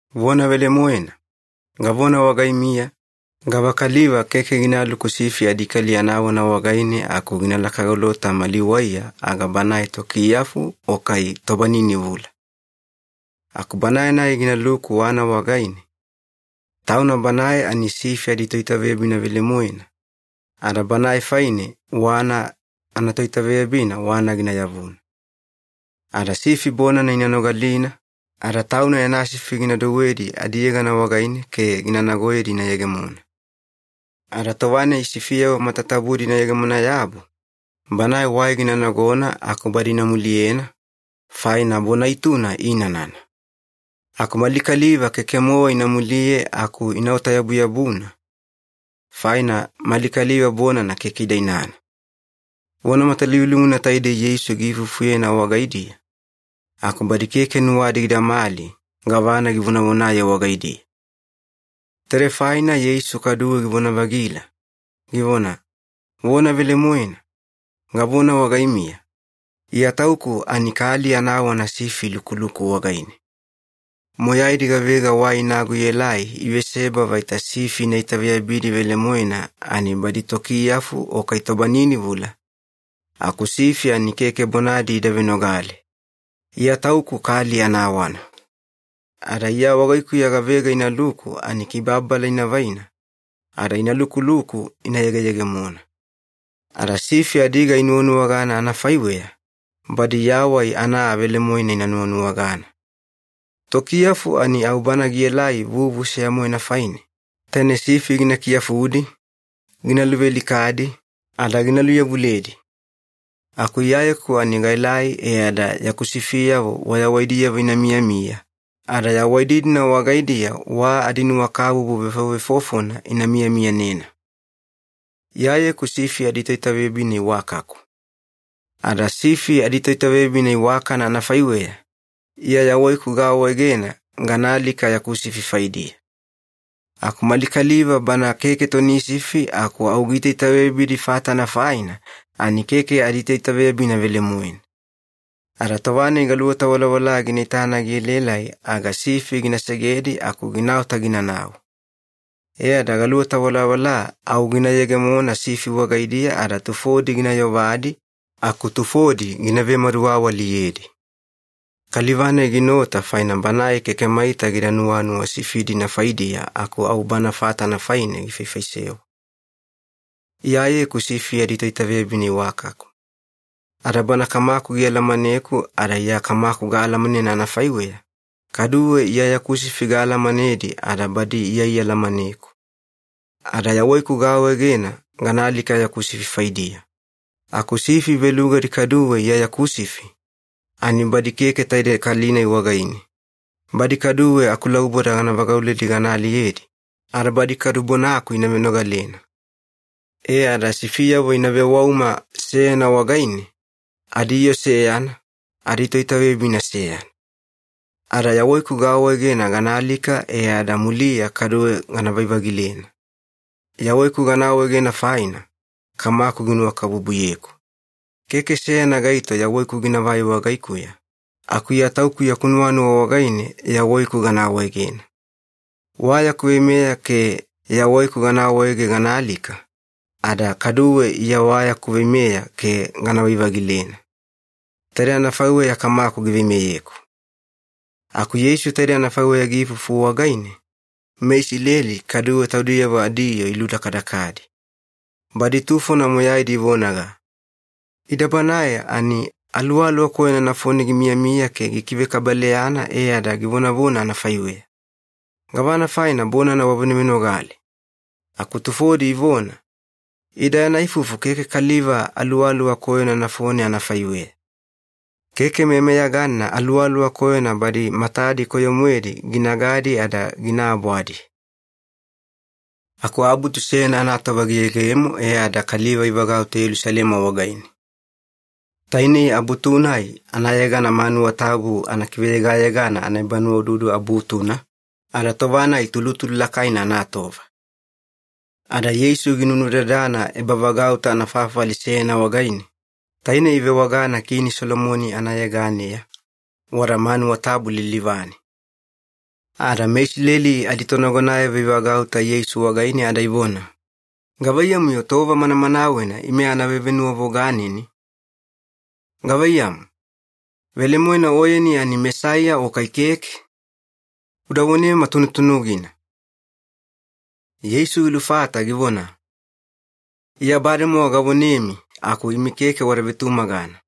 “Vona velemoena, gavona wagaimiya, gavakaliva keke ginaluku sifi adikali anawana wagaine aku ginalaka golota mali waiya aga banae tokiyafu o kai tobaninivula. Aku banae-nai ginaluku wana wagaine, tauna banae ani sifi aditoitaveyabina velemoena, ada banae faine wana anatoitaveyabina wana gina yavuna. Ada sifi bonana ina nogalina, ada tauna yana sifi gina douwedi adiyegana wagaine ke gina nagoyedi ina yegemona. Ada tova-nai sifiyavo matatabudi ina yegemona-yabu, banae wai gina nagona aku badi ina muliyena, faina bona ituna iinanana. Aku mali kaliva keke-mowa ina muliye aku inaota-yabuyabuna, faina mali kaliva bonana keke ida inana.” Vona matalivulivuna taidei Yeisu giifufuyena wagaidiya, aku badi keke nuwadi gidamali gavana givonavonaye wagaidiya. Taidei faina Yeisu kaduwe givona-vagila, givona, “Vona velemoena, gavona wagaimiya, Iya Tauku ani kali anawana sifi ilukuluku wagaine. Moyaidi gavega wai inago ielai iveseba vaita sifi ina itaveyabidi velemoena ani badi tokiyafu o kai tobaninivula, aku sifi ani keke bonadi ida venogale. Iya Tauku kali anawana. Ada Iya wagaikuya gavega inaluku ani kibababala ina vaina, ada ina lukuluku ina yegeyegemona. Ada sifi adiga inuwanuwagana anafaiweya, badi yawai ana aa velemoena ina nuwanuwagana. Tokiyafu ani au bana gielai vuvu seya-moena faine, taine sifi gina kiyafudi, gina luvealikadi, ada gina luyavuledi. Aku Iyayeku ani gaelai e ada yaku sifiyavo wayawaidiyavo ina miyamiya, ada yawaidi-dina wagaidiya wa adinuwakabubu vefovefofona ina miyamiyanena. “Iyayeku sifi aditoitaveyabina iwakaku. Ada sifi aditoitaveyabina iwakana anafaiweya, Iya yawaiku gaawaegena gana alika yaku sifi faidiya. Aku mali kaliva bana keke toni sifi aku au giitaitaveyabidi fatana faina ani keke aditoitaveyabina velemoena. Ada tova-nai galuweta walawala gina itana gielaelai aga sifi gina segedi aku ginaota ginanau. E ada galuweta walawala au gina yegemona sifi wagaidiya ada tufodi gina yovadi aku tufodi gina vemaduwawaliyedi. Kaliva-nai ginaota faina banae keke maita gida nuwanuwa sifi-dina faidiya aku au bana fatana faine gifaifaisewa. “Iyayeku sifi aditoitaveyabina iwakaku. Ada Bana Kamaku gialamaneku ada Iya Kamaku gaalamanena anafaiweya, kaduwe Iya yaku sifi gaalamanedi ada badi Iya ialamaneku. Ada yawaiku gaawaegena gana alika yaku sifi faidiya. Aku sifi velugadi kaduwe Iya yaku sifi, ani badi keke taidei kali-nai wagaine. Badi kaduwe akulauboda gana vagauledi gana aliyedi, ada badi kadu bonaku ina venogalena. E ada sifiyavo ina vewauma seyana wagaine, adiyoo seyana, adiToitaveyabina seyana. Ada yawaiku gaawaegena gana alika e ada muliya kaduwe ganavai-vagilena. Yawaiku gana awaegena faina, Kamaku ginuwakabubuyeku. Keke seyana gaito yawaiku ginavai wagaikuya, aku Iya Tauku yaku nuwanuwa wagaine yawaiku gana awaegena. Wa yaku veimeya ke yawaiku gana awaege gana alika, ada kaduwe Iya wa yaku veimeya ke ganavai-vagilena. Taidei anafaiweya Kamaku giveimeyeku.” Aku Yeisu taidei anafaiweya giifufu wagaine, meIsileli kaduwe taudiyavo adiyoo iludakadakadi. Badi tufona moyaidi ivonaga, “Ida banae ani aluwaluwa koyona nafone gimiyamiya ke gikivekabaleyana e ada givonavona anafaiweya. Gavana faina bonana wavenovenogale?” Aku tufodi ivona, “Ida yana ifufu keke kaliva aluwaluwa koyona nafone anafaiweya. Keke meyameyaganina aluwaluwa koyona badi matadi koyo-moedi ginagadi ada gina abwadi.” Aku abutu seyana anatova giyegemo e ada kaliva ivagauta Yelusalema wagaine. Tainei abutu-nai anayegana Manuwa Tabu Anakiveyegayegana Anaebanuwaududu Abutuna, ada tova-nai tulutulu lakaina anatova. Ada Yeisu ginunudadana ebavagauta anafafali seyana wagaine, taine ivewagana Kini Solomoni anayeganeya, wada manuwa tabu lilivane. Ada meIsileli aditonagonayavo ivagauta Yeisu wagaine ada ivona, “Gavaiyamu-yo tova manamanawena ime ana vevenuwavoganeni? Gavaiyamu, velemoena Oyeni ani Mesaiya o kai keke? Uda vonema tunutunugina.” Yeisu gilufata givona, “Iya bademowa gavonemi aku imi keke wada vetumagana.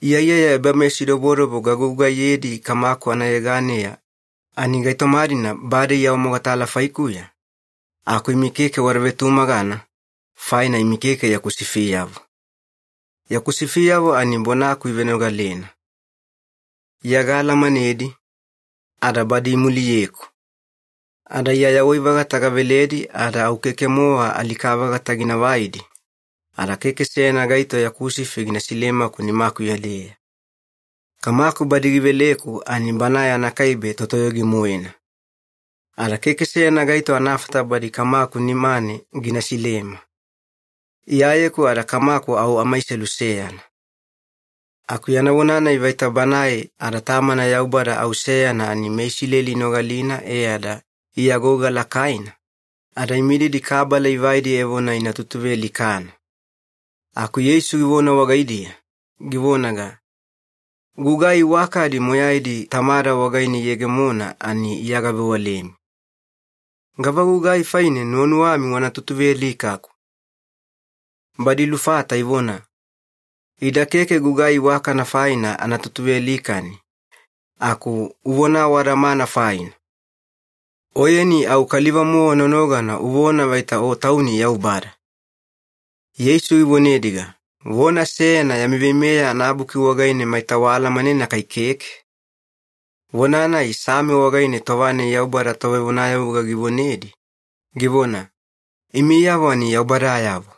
Iyaiyaya ebameyasidobodobo gagugaiyedi Kamaku anayeganeya ani gaitoma-dina bade iawamogatala faikuya, aku imi keke wada vetumagana, faina imi keke yaku sifiyavo. Yaku sifiyavo ani bonaku ivenogalena. Iya gaalamanedi, ada badi imuliyeku. Ada Iya yawai-vagata gaveledi ada au keke-mowa alika-vagata gina vaidi, ada keke seyana gaito yaku sifi gina silemaku nimakuya-deya. Kamaku badi giveleku ani Banae anakaibe Totoyogi-moena. Ada keke seyana gaito anafata badi Kamaku nimane gina silema. Iyayeku ada Kamaku au amaiselu seyana.” Aku yana vona-nai vaita Banae ada Tamana Yaubada au seyana ani meIsileli inogalina e ada iagouga lakaina, ada imididi kabala ivaidi evona ina tutuvealikana. Aku Yeisu givona wagaidiya, givonaga, “Gugai iwakadi moyaidi Tamada wagaine iyegemona ani Iya gavewalemi. Gavagugai faine nuwanuwami wana tutuvealikaku?” Badi ilufata ivona, “Ida keke gugai iwakana faina ana tutuvealikani, aku uvona awadamana faina. Oyeni au kaliva-mowa nonogana uvona vaita O Tauni Yaubada.” Yeisu givonediga, “Vona seyana yami Veimeya anaBuki wagaine maita waalamanena kai keke? Vona-nai Same wagaine tova-nai Yaubada tovevonayavuga givonedi, givona, ‘Imiyavo ani yaubadayavo.’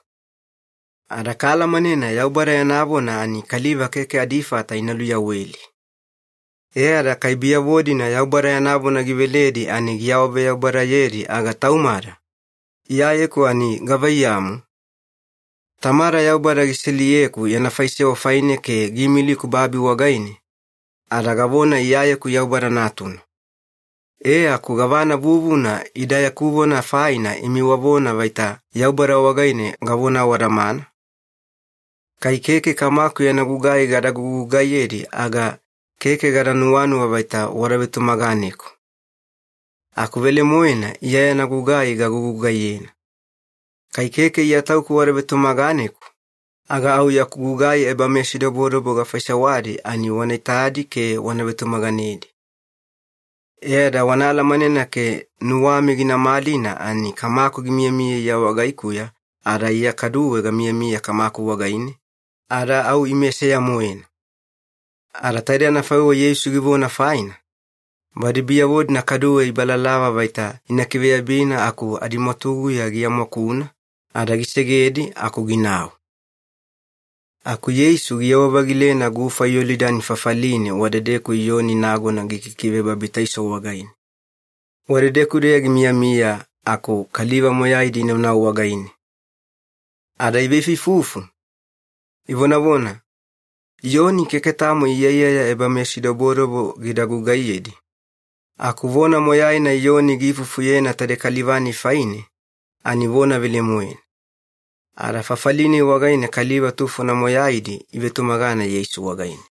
Ada kaalamanena Yaubada yana vona ani kaliva keke adifata ina luyaweli. E ada kai biyavo-dina Yaubada yana vona giveledi ani giawaveyaubadayedi aga taumada, Iyayeku ani gavaiyamu? Tamada Yaubada giseliyeku yana faisewa faine ke giimiliku babi wagaine, ada gavona, ‘Iyayeku Yaubada Natuna.’ E aku gavana vuvuna ida yaku vona faina imi wavona vaita Yaubada wagaine gavona awadamana? Kai keke Kamaku yana gugai gada gugugaiyedi aga keke gada nuwanuwa vaita wada vetumaganeku. Aku velemoena Iya yana gugai gagugugaiyena. Kai keke Iya Tauku wada vetumaganeku, aga au yaku gugai ebameyasidobodobo gafaisewadi ani wana itadi ke wana vetumaganedi. E ada wana alamanena ke nuwami gina malina ani Kamaku gimiyamiya Iya wagaikuya ada Iya kaduwe gamiyamiya Kamaku wagaine, ada au Ime seya-moena.” Ada taide anafaiweya Yeisu givona faina, badi biyavo-dina kaduwe ibalalava vaita ina kiveyabina aku adimwatuguya giamwakuna, ada gisegedi aku ginau. Aku Yeisu giyewa-vagilena gufa Yolidani fafaline wadedeku Iyoni nagona gikikivebabitaiso wagaine. Wadedeku-deya gimiyamiya aku kaliva moyaidi inaunau wagaine. Ada iveifuifufu, ivonavona, “Iyoni keke tamo iyaiyaya ebameyasidobodobo gida gugaiyedi, aku vona moyaina Iyoni giifufuyena taidei kaliva-nai faine ani vona velemoena.” Ada fafali-nai wagaine kaliva tufona moyaidi ivetumagana Yeisu wagaine.